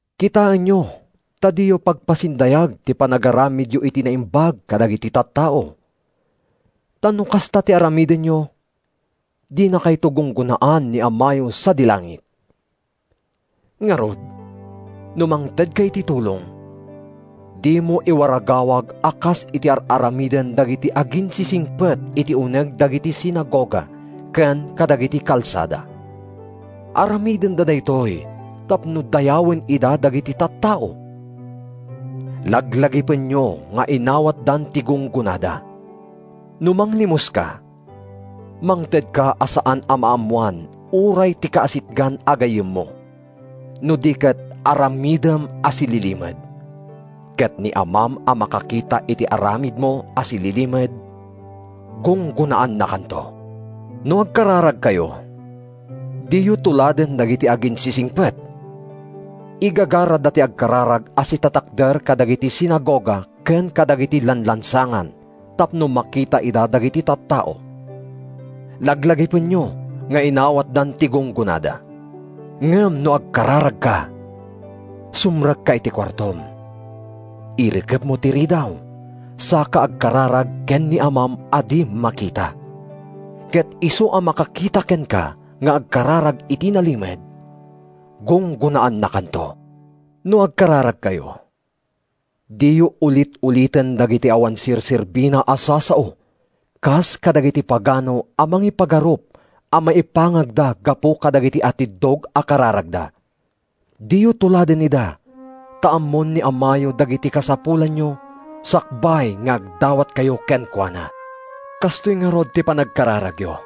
“Kitaenyo ta diyo pagpasindayag ti panagaramidyo iti naimbag kadagiti tattao. Ta no kasta ti aramidenyo, dinakayto gunggonaan ni Amayo sadi langit. “Ngarud, no mangtedka iti tulong, dimo iwaragawag a kas iti ar-aramiden dagiti aginsisingpet iti uneg dagiti sinagoga ken kadagiti kalsada. Aramidenda daytoy tapno dayawen ida dagiti tattao. Laglagipenyo nga inawatdan ti gunggonada. No manglimoska, mangtedka a saan a maammoan uray ti kaasitgan a gayyemmo, no di ket aramidem a sililimed. Ket ni Amam a makakita iti aramidmo a sililimed, gunggonaannakanto.” “No agkararagkayo, diyo tuladen dagiti aginsisingpet! Igagarada ti agkararag a sitatakder kadagiti sinagoga ken kadagiti lanlansangan tapno makita ida dagiti tattao. Laglagipenyo nga inawatdan ti gunggonada. Ngem no agkararagka, sumrekka iti kuartom, irikepmo ti ridaw, saka agkararag ken ni Amam a di makita. Ket isu a makakita kenka nga agkararag iti nalimed, gunggonaannakanto. “No agkararagkayo, diyo ulit-uliten dagiti awan serserbina a sasao, kas kadagiti pagano a mangipagarup a maipangagda gapu kadagiti atiddog a kararagda. Diyo tuladen ida; ta ammon ni Amayo dagiti kasapulanyo sakbay nga agdawatkayo kenkuana. Kastoy ngarud ti panagkararagyo: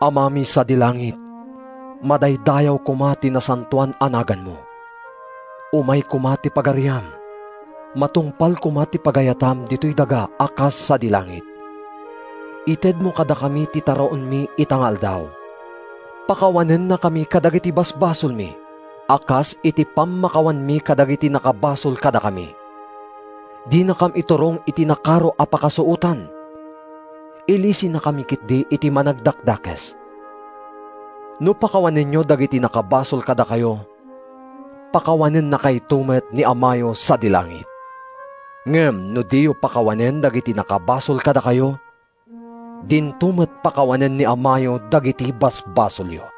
‘Amami sadi langit: Madaydayaw koma ti nasantoan a naganmo; Umay koma ti Pagariam; Matungpal koma ti pagayatam ditoy daga a kas sadi langit. Itedmo kadakami ti taraonmi ita nga aldaw; Pakawanennakami kadagiti basbasolmi, A kas iti pammakawanmi kadagiti nakabasol kadakami; Dinakam iturong iti nakaro a pakasuotan; Ilisinakami ketdi iti Managdakdakes.’ “No pakawanenyo dagiti nakabasol kadakayo pakawanennakayto met ni Amayo sadi langit. Ngem no diyo pakawanen dagiti nakabasol kadakayo, dinto met pakawanen ni Amayo dagiti basbasolyo.”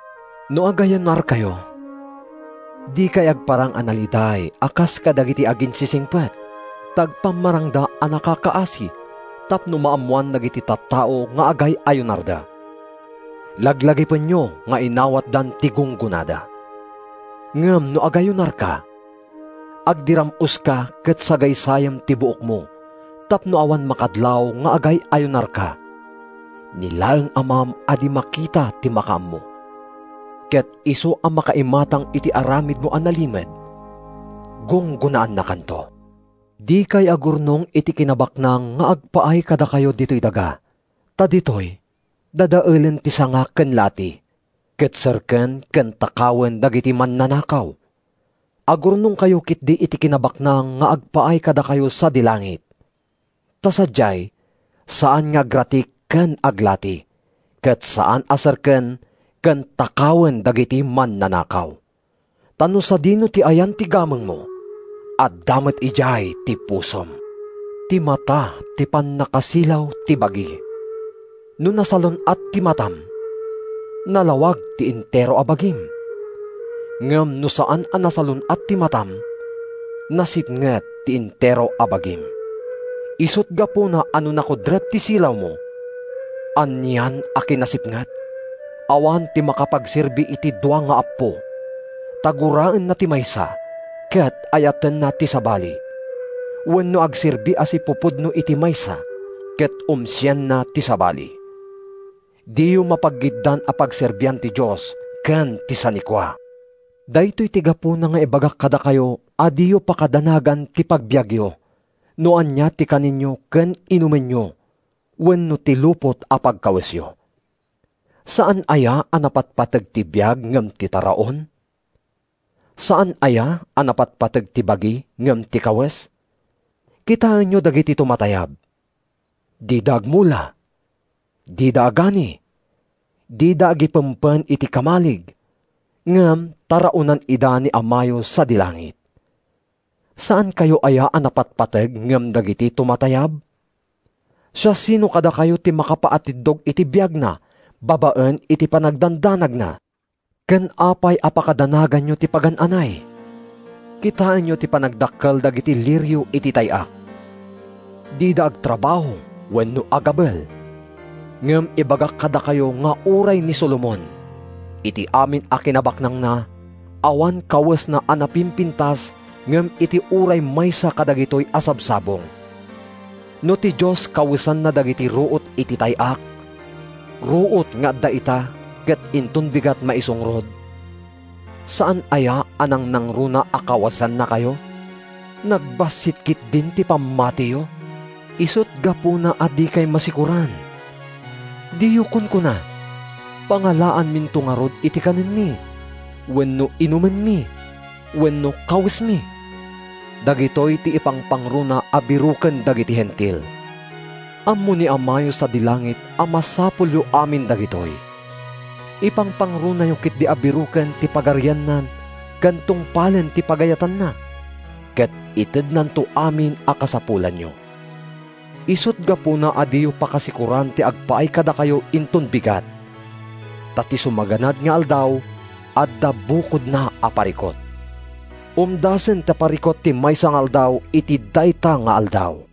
“No agayunarkayo, dikay agparang a naliday a kas kadagiti aginsisingpet, ta agpammarangda a nakakaasi tapno maammoan dagiti tattao nga agay-ayunarda. Laglagipenyo nga inawatdan ti gunggonada. Ngem no agayunarka, agdiram-oska ket sagaysayem ti buokmo tapno awan makadlaw nga agay-ayunarka—ni laeng Amam a di makita ti makaammo. Ket isu a makaimatang iti aramidmo a nalimed, gunggonaannakanto.” “Dikay agurnong iti kinabaknang nga agpaay kadakayo ditoy daga, ta ditoy dadaelen ti sanga ken lati, ket serken ken takawen dagiti mannanakaw. Agurnongkayo ketdi iti kinabaknang nga agpaay kadakayo sadi langit, ta sadiay saan nga agratik ken aglati, ket saan a serken ken takawen dagiti mannanakaw. Ta no sadino ti ayan ti gamengmo, adda met idiay ti pusom.” “Ti mata ti pannakasilaw ti bagi: no nasalun-at ti matam, nalawag ti entero a bagim. Ngem no saan a nasalun-at ti matam, nasipnget ti entero a bagim. Isut’ gapuna a no nakudrep ti silawmo, anian a kinasipnget!” “Awan ti makapagserbi iti dua nga appo: ta guraenna ti maysa ket ayatenna ti sabali, wenno agserbi a sipupudno iti maysa ket umsienna ti sabali. Diyo mapaggiddan a pagserbian ti Dios ken ti sanikua.” “Daytoy ti gapuna nga ibagak kadakayo a diyo pakadanagan ti pagbiagyo, no ania ti kanenyo ken inumenyo, wenno ti lupot a pagkawesyo. Saan aya a napatpateg ti biag ngem ti taraon? Saan aya a napatpateg ti bagi ngem ti kawes? Kitaenyo dagiti tumatayab: dida agmula, dida agani, dida agipempen iti kamalig. Ngem taraonan ida ni Amayo sadi langit. Saankayo aya a napatpateg ngem dagiti tumatayab? Siasino kadakayo ti makapaatiddog iti biagna babaen iti panagdandanagna? “Ken apay a pakadanaganyo ti pagan-anay? Kitaenyo ti panagdakkel dagiti lirio iti tay-ak: dida agtrabaho wenno agabel. Ngem ibagak kadakayo nga uray ni Solomon, iti amin a kinabaknangna, awan kawesna a napimpintas ngem iti uray maysa kadagitoy a sabsabong. No ti Dios kawesanna dagiti ruot iti tay-ak, ruot nga adda ita ket inton bigat maisungrod, saan aya a nangnangruna a kawesannakayo? Nagbassit ketdin ti pammatiyo! Isut’ gapuna a dikay masikoran. Diyo kunkuna, ‘Pangalaanminto ngarud iti kanenmi? wenno inumenmi? wenno kawesmi?’ Dagitoy ti ipangpangruna a biroken dagiti Hentil. Ammo ni Amayo sadi langit a masapulyo amin dagitoy. Ipangpangrunayo ketdi a biroken ti Pagarianna ken tungpalen ti pagayatanna, ket itednanto amin a kasapulanyo. Isut’ gapuna a diyo pakasikoran ti agpaay kadakayo inton bigat; ta ti sumaganad nga aldaw adda bukodna a parikut. Umdasen ti parikut ti maysa nga aldaw iti dayta nga aldaw.”